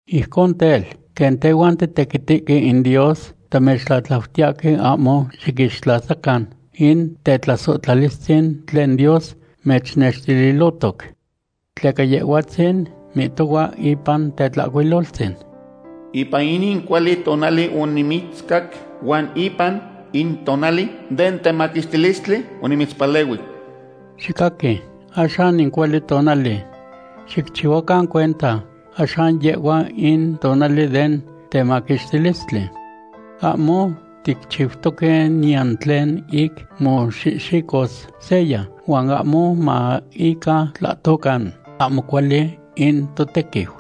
Ijcon tel, quen tehuan titequitihque in Dios, tamechtlatlautiyahque ahmo xiquixtlasacan in tetlasohtlalistzin tlen Dios mechnextililohtoc. Tleca Yehhuatzin mihtohua ipan Tetlahcuiloltzin: Ipan in cuali tonali onimitzcac, huan ipan in tonali den temaquixtilistli onimitzpalehui. Xicaqui, axan in cuali tonali. Xicchihuacan cuenta, axan yehhua in tonali den temaquixtilistli. Ahmo ticchiutoque niyan tlen ic moxihxicos seya, huan ahmo ma ica tlahtocan ahmo cuali in totequiu.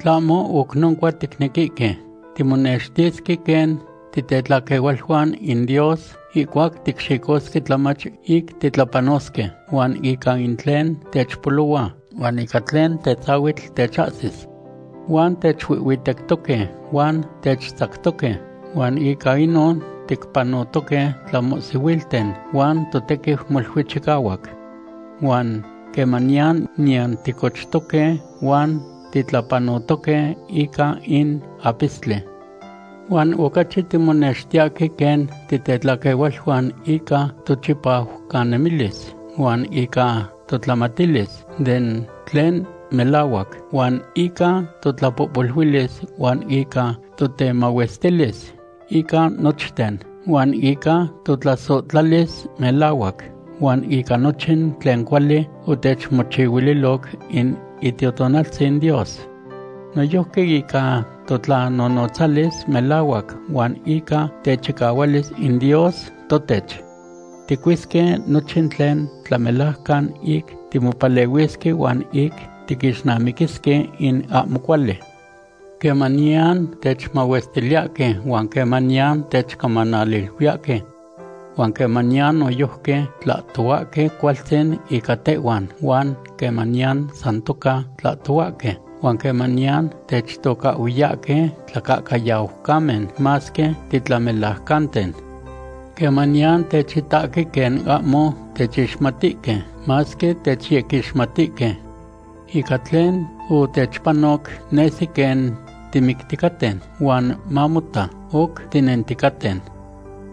Tlahmo oc noncua ticnequihque timonextisque quen titetlaquehualuan in Dios ihcuac ticxicosque tlamach ic titlapanosque, huan ica in tlen techpolohua, huan ica tlen tetzahuitl techahsis. Huan techuihhuitectoque huan techtzactoque, huan ica inon ticpanotoque tlamohsihuilten, huan totequiu molui chicahuac. Huan quemaniyan niyan ticochtoque huan titlapanotoque ica in apistli. Huan ocachi timonextiyahque quen titetlaquehualuan ica tochipajcanemilis huan ica totlamatilis den tlen melahuac, huan ica totlapohpoluilis, huan ica totemahuestilis ica nochten, huan ica totlasohtlalis melahuac, huan ica nochin tlen cuali otechmochihuiloc in Itiotonaltzin Dios. Noyojqui ica totlanonotzalis melahuac huan ica techicahualis in Dios totech. Ticuisque nochin tlen tlamelajcan ic timopalehuisque huan ic tiquixnamiquisque in ahmo cuali. Quemaniyan techmahuestiliyahque huan quemaniyan techcamanaluiyahque. Huan quemaniyan noyojqui tlahtohuahque cualtzin ica tehhuan huan quemaniyan san toca tlahtohuahque. Huan quemaniyan techtocahhuiyahque tlacahcayaucamen masque titlamelajcanten. Quemaniyan techitahque quen ahmo techixmatihque masque techyequixmatihque. Ica tlen otechpano, nesi quen timicticaten, huan mamota, oc tinenticaten.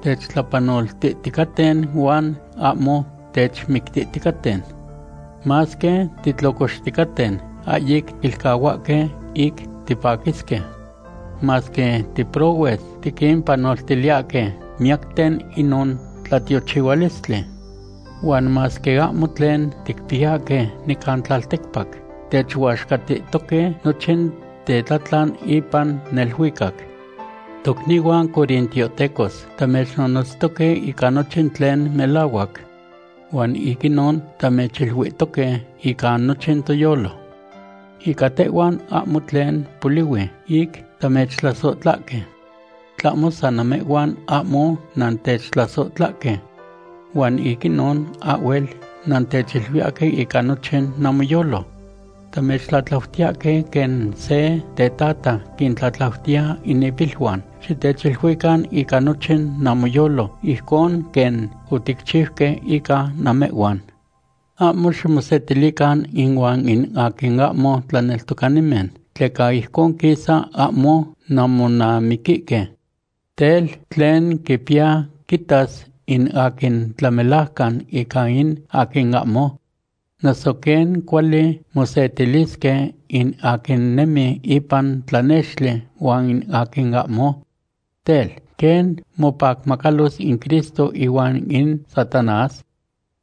Techtlapanoltihticaten huan ahmo techmictihticaten. Masque titlocoxticaten, ahyic tiquilcahuahque ic tipaquisque. Masque tiprohues, tiquimpanoltiliyahque miyacten inon tlatiochihualistli. Huan masque ahmo tlen ticpiyahque nican tlalticpac, techuaxcatihtoque nochin tetlatlan ipan neluicac. Tocnihuan corintiohtecos, tamechnonotztoque ica nochin tlen melahuac. Huan ic inon tamechiluihtoque ica nochin toyolo. Ica tehhuan ahmo tlen polihui ic tamechtlasohtlahque. Tlahmo san namehhuan ahmo nantechtlasohtlahque. Huan ic inon ahhuel nantechiluiyahque ica nochin namoyolo. Tamechtlatlautiyahque quen se tetata quintlatlautiya in ipiluan, xitechiluican ica nochin namoyolo ijcon quen oticchiuque ica namehhuan. Ahmo ximosetilican inuan in aquin ahmo tlaneltocanimen, tleca ijcon quisa ahmo nanmonamiquihque. Tel, ¿tlen quipiya quitas in aquin tlamelajcan ica in aquin ahmo? Noso, ¿quen cuali mosetilisque in aquin nemi ipan tlanextli huan in aquin ahmo? Tel, ¿quen mopacmacalos in Cristo ihuan in Satanás?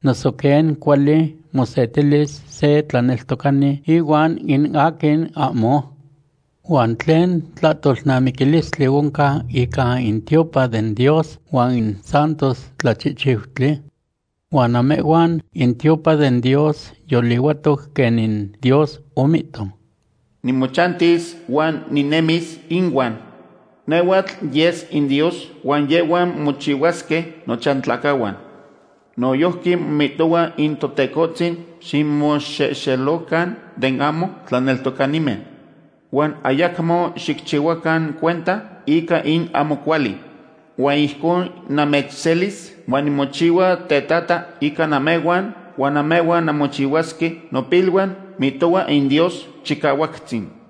Noso, ¿quen cuali mosetilis se tlaneltocani ihuan in aquin ahmo? ¿Huan tlen tlahtolnamiquilistli oncan ica in tiopan den Dios huan in santos tlachihchiutli? Huan namehhuan in tiopan den Dios yolihuatoc, quen in Dios omihto: Nimochantis huan ninemis inuan. Nehhuatl yes inDios, huan yehhuan mochihuasque nochantlacahuan. Noyojqui mihtohua in Totecohtzin: Ximoxelocan den ahmo tlaneltocanimen. Huan ayacmo xicchihuacan cuenta ica in ahmo cuali. Huan ijcon namechselis, huan nimochihua tetata ica namehhuan huan namehhuan nanmochihuasque nopiluan, mihtohua in Dios Chicahuactzin.